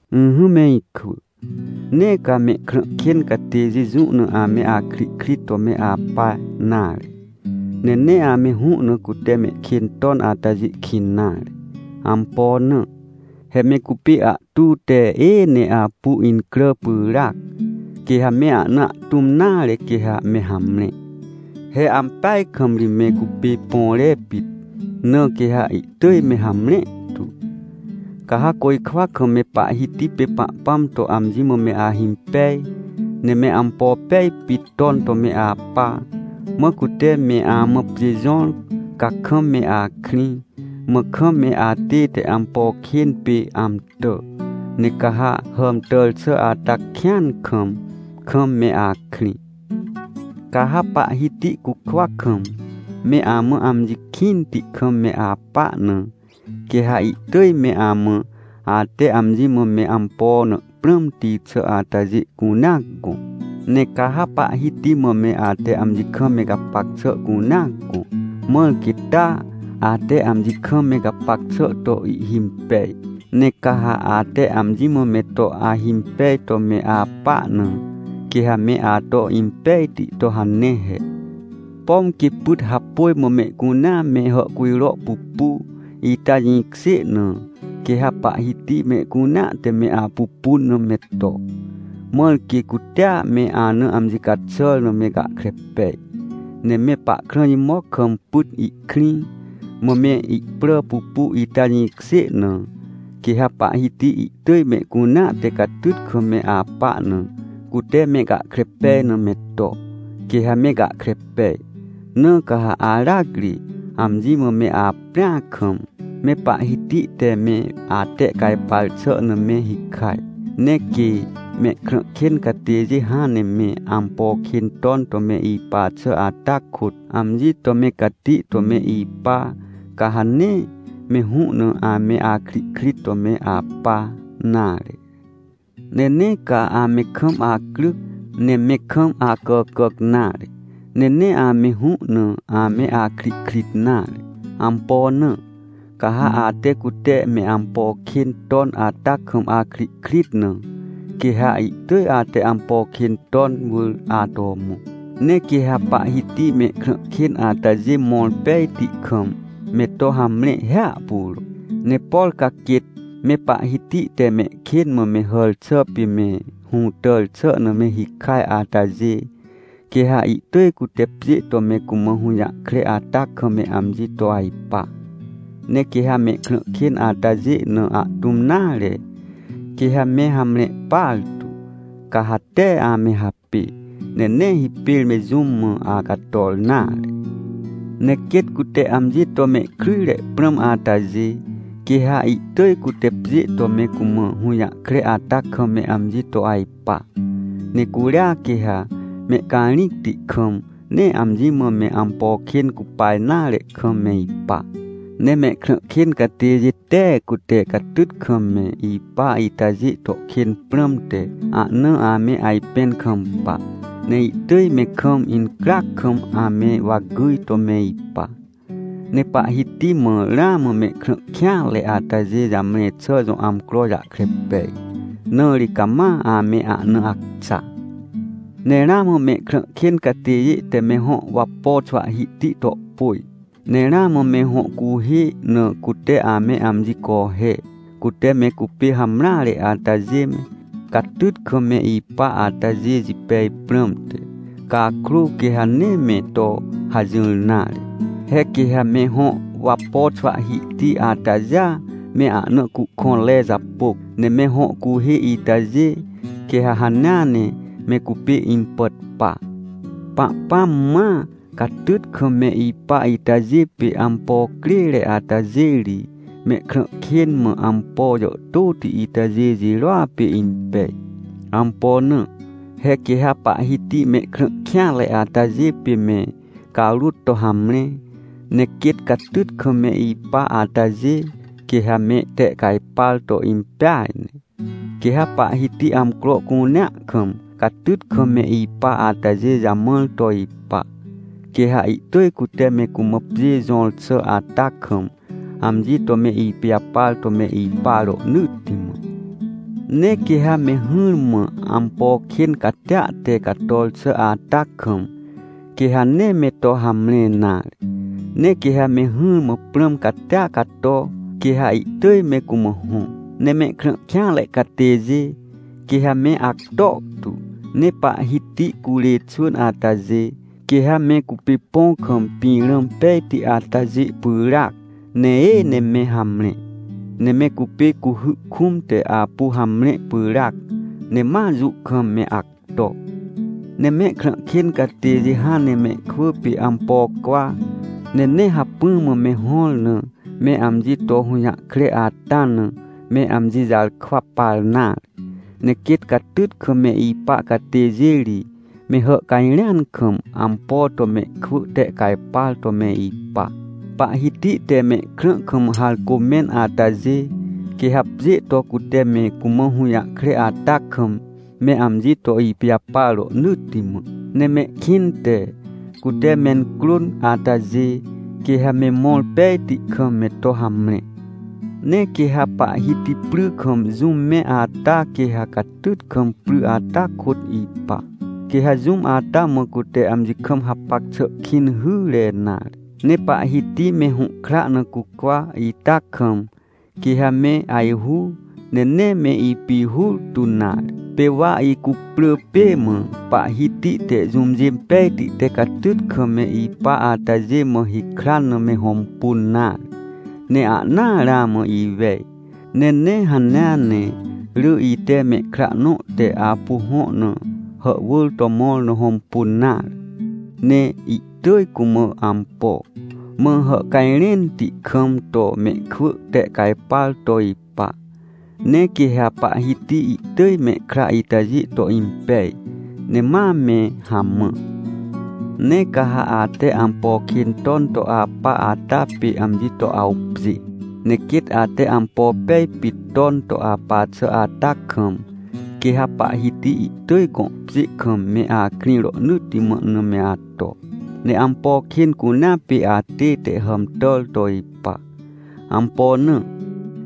Ỹhỹ me ikwỳ, nee ca mehkrã kên catêjê jũ na ame akrihkrit to me apa nare. Ne nee ame hũ na cute mehkên ton atajê kĩn nare. Ampo na? He me cupê ahtu te êê ne apu incrà pyràac, quê ha me ahna ahtũm nare quê ha me hamre. He ampeaj kam ri me cupê põre pit, na quê ha ihtỳj me hamre tu. Ca ha côjkwa kam me Pahhiti pê Pahpãm to amji mã me ahimpej, ne me ampo pej pit ton to me apa. Mã cute me amã pjê jõr, ca kam me akrĩ, mã kam me atête ampo kên pê amtà. Ne ca ha hàmtàr xà ata kĩan kam, kam me akrĩ. Ca ha Pahhiti cukwa kam, me amã amji kĩnti kam me apa na, quê ha ihtỳj me amã, ate amji mã me ampo na prãmti xà atajê cunea gõ. Ne ca ha Pahhiti mã me ate amji kam me gapac xà cunea gõ, mãr quê taa, ate amji kam me gapac xà to ihhimpej. Ne ca ha ate amji mã me to ahimpej to me apa na, quê ha me ato impejti to hane he. Pom quê pyt hapôj mã mehcunea me hàhcujro pupu, ita jĩkjê na, quê ha Pahhiti mehcunea te me apupun na me to, mãr quê cutea me ana amji caxàr na me gahkre pej. Ne me pahkrã jimoc kam pyt ihkrĩ, mã me ihprà pupu, ita jĩkjê na, quê ha Pahhiti ihtỳj mehcunea te catyt kam me apa na, cute me gahkre pej na me to, quê ha me gahkre pej. Na ca ha aracri, amji mã me aprĩa kam, me Pahhiti te me atehcajpar xà na me hikaj. Ne quê mehkrã kên catêjê hãn ne me ampo kên ton to me ipa xà ata kôt, amji to me cati to me ipa, ca ha nee me hũ na ame akrihkrit to me apa nare. Ne nee ca ame kam acryc, ne me kam acàcàc nare. Ne nee ame hũ na ame akrihkrit nare. Ampo na? Ca ha ate, cute me ampo kên ton ata kam akrihkrit na, quê ha ihtỳj ate ampo kên ton wỳr ato mõ. Ne quê ha Pahhiti mehkrã kên atajê mõr pejti kam, me to hamre hiahpuro. Ne por ca quêt me Pahhiti te mehkên mã me hàr xà pê me hũtàr xà na me hikaj atajê, quê ha ihtỳj cute pjê to me cumã hũjahkre ata kam me amji to ajpa. Ne quê ha mehkrã kên atajê na ahtũm nare, quê ha me hamre partu. Ca ha tee ame hapê, ne nee hipêr me jũm mã acator nare. Ne quêt cute amji to mehkryjre prãm atajê, quê ha ihtỳj cute pjê to me cumã hũjahkre ata kam me amji to ajpa. Ne curia, quê ha mehcarĩcti kam, nee amji mã me ampo kên cupa nare kam me ipa. Ne mehkrã kên catêjê tee cute catyt kam me ipa itajê to kên prãmte, ahna ame ajpẽn kampa. Ne ihtỳj me kam incryac kam ame wa gyj to me ipa. Ne Pahhiti mã ramã mehkrã kêanre atajê jamre xà jõ amcro jahkre pej, na ri cama ame ahna acxa. Ne ramã mehkrã kên catêjê te me hõ wapo xwahhihti tohpôj, ne ramã me hõ cuhê na cute ame amji cohe, cute me cupê hamreare atajê me, catyt kam me ipa atajê jipej prãmte. Cakrô, quê ha nee me to hajỹr nare. He quê ha me hõ wapo xwahhihti atajêa me ahna cuhkõnre japôc, ne me hõ cuhê itajê, quê ha hanea ne me cupê impàt pa. Pahpãm mãa, catyt kam me ipa itajê pê ampo crêre atajê ri, mehkrã kên mã ampo jàhtôti itajê jirôa pê impej. Ampo na? He quê ha Pahhiti mehkrã kêanre atajê pê me carôt to hamre, ne quêt catyt kam me ipa atajê, quê ha mehtehcajpar to impeaj ne. Quê ha Pahhiti amcro cunea kam, catyt kam me ipa atajê jamãr to ipa, quê ha ihtỳj cute me cumã pjê jõr xà ata kam, amji to me ipijapar to me ipa rohnỳtti mã. Ne quê ha me hỹrmã ampo kên catia te cator xà ata kam, quê ha nee me to hamre nare. Ne quê ha me hỹrmã prãm catia cato, quê ha ihtỳj me cumã hõ. Ne mehkrã kêanre catêjê, quê ha me acto tu. Ne Pahhiti curê xwỳn atajê, quê ha me cupê põ kam pĩrã pejti atajê pyràac, ne êê ne me hamre. Ne me cupê cuhy kũm te apu hamre pyràac, ne ma jũ kam me acto. Ne mehkrã kên catêjê hãn ne mehkwỳ pê ampo cwa, ne nee hacpỹ mã me hõr na me amji to hũjahkre ata na, me amji jarkwa par nare. Ne quêt catyt kam me ipa catêjê ri me hàhcajrẽan kam, ampo to mehkwỳ tehcajpar to me ipa. Pahhiti te mehkrã kam harcô mẽn atajê, quê ha pjê to cute me cumã hũjahkre ata kam me amji to ipijapar rohnỳtti mã, ne mehkĩnte, cute mencrôn atajê, quê ha me mõr pejti kam me to hamre. Ne quê ha Pahhiti pry kam jũm mẽ ata, quê ha catyt kam pry ata kôt ipa, quê ha jũm ata mã cute amji kam hapac xà kĩn hyre nare. Ne Pahhiti me hũhkra na cucwa ita kam, quê ha me ajhu, ne nee me ipihur tu nare. Pê wa ituwre na, Pahhiti te jũmjê pejti te catyt kam me ipa atajê mã hikran na me hõmpun nare, ne ahnaa ramã iwej. Ne nee hanea ne, rỳ ite mehkra nõ te apu hõ na hàhwỳr to mõr na hõmpun nare. Ne ihtỳj cumã ampo, mã hàhcajrẽnti kam to mehkwỳ tehcajpar to ipa. Ne quê ha Pahhiti ihtỳj mehkra itajê to impej, ne ma me hamã. Ne ca ha ate ampo kên ton to apa ata pê amji to awpjê, ne quêt ate ampo pej pit ton to apa xà ata kam, quê ha Pahhiti ihtỳj gõ pjê kam me akrĩ rohnỳtti mã na me ato, ne ampo kên cunea pê atête hàmtàr to ipa. Ampo na?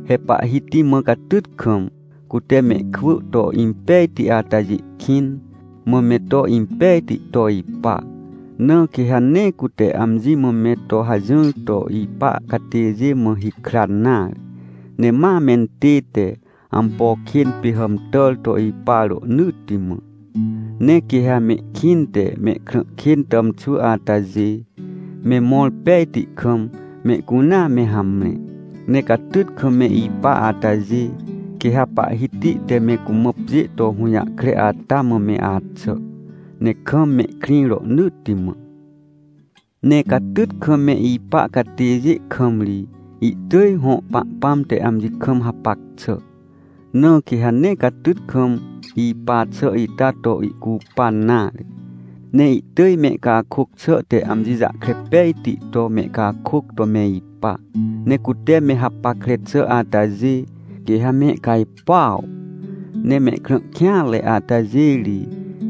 He Pahhiti mã catyt kam, cute mehkwỳ to impejti atajê kĩn, mã me to impejti to ipa. Na quê ha nee cute amji mã me to hajỹr to ipa catêjê mã hikran nare, ne ma mentête ampo kên pê hàmtàr to ipa rohnỳtti mã. Ne quê ha mehkĩnte mehkrã kên tàmxwỳ atajê me mõr pejti kam, mehcunea me hamre. Ne catyt kam me ipa atajê, quê ha Pahhiti te me cumã pjê to hũjahkre ata mã me axà, ne kam mehkrĩ rohnỳtti mã. Ne catyt kam me ipa catêjê kam ri, ihtỳj hõ Pahpãm te amji kam hapac xà, na quê ha nee catyt kam ipa xà ita to ihcupan nare. Ne ihtỳj mehcakôc xà te amji jahkre pejti to mehcakôc to me ipa, ne cute me hapackre xà atajê, quê ha mehcajpuaw. Ne mehkrã kêanre atajê ri,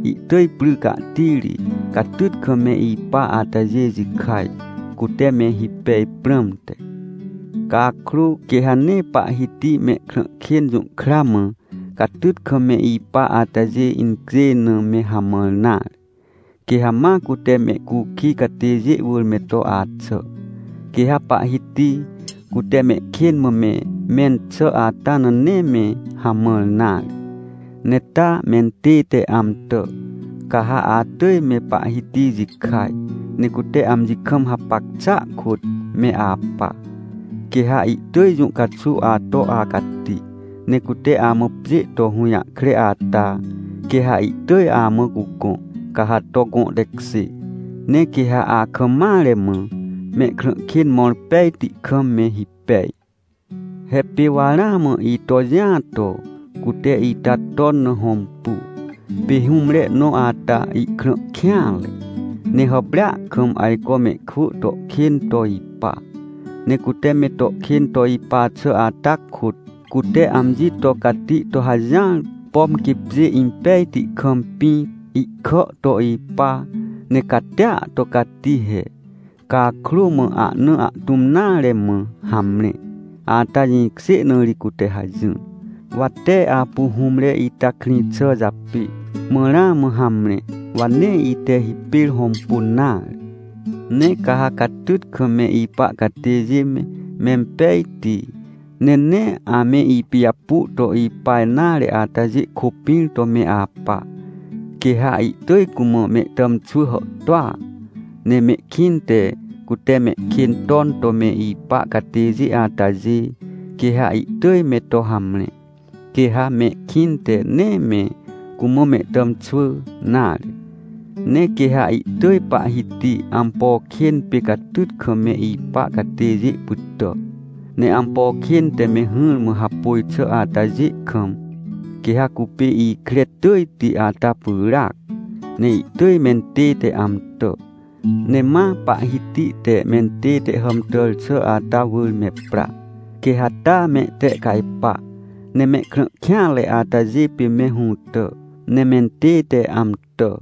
ihtỳj pry cahtiri, catyt kam me ipa atajê jikaj, cute me hipej prãmte. Cakrô, quê ha nee Pahhiti mehkrã kên jũhkra mã, catyt kam me ipa atajê incjêj na me hamãr nare. Quê ha ma cute mehcukij catêjê wỳr me to axà, quê ha Pahhiti, cute mehkên mã me mẽn xà ata na nee me hamãr nare, ne taa mentête amtà. Ca ha atỳj me Pahhiti jikaj, ne cute amji kam hapac xàa kôt me apa. Quê ha ihtỳj jũ caxuw ato acati, ne cute amã pjê to hũjahkre ata, quê ha ihtỳj amã cugõ, ca ha to gõ tekjê. Ne quê ha akam mare mã, mehkrã kên mõr pejti kam me hipej. He pê wa ramã ito jĩa to, cute ita ton na hõmpu. Pê hũmre nõ ata ihkrã kêanre, ne hàprêa kam ajco mehkwỳ to kên to ipa. Ne cute me to kên to ipa xà ata kôt, cute amji to cati to hajỹar, pom quê pjê impejti kam pĩ ihkà to ipa, ne catia to cati he. Cakrô, mã ahna ahtũm nare, mã hamre, ata jĩkjê na ri cute hajỹr. Wa tee apu hũmre ita krĩ xà japê, mã ramã hamre, wa nee ite hipêr hõmpun nare. Ne ca ha catyt kam me ipa catêjê me, mempejti, ne nee ame ipijapu to ipa nare atajê kôpĩr to me apa. Quê ha ihtỳj cumã mehtàmxwỳ hàhtôa. Ne mehkĩnte, cute mehkên ton to me ipa catêjê atajê, quê ha ihtỳj me to hamre. Quê ha mehkĩnte nee me cumã mehtàmxwỳ nare. Ne quê ha ihtỳj Pahhiti, ampo kên pê catyt kam me ipa catêjê pytà, ne ampo kên te me hỹrmã hapôj xà atajê kam, quê ha cupê ikre tỳjti ata pyràac, ne ihtỳj mentête amtà. Ne ma Pahhiti te mentête hàmtàr xà ata wỳr me pra, quê ha taa mehtehcajpa, ne mehkrã kêanre atajê pê me hũtà, ne mentête amtà.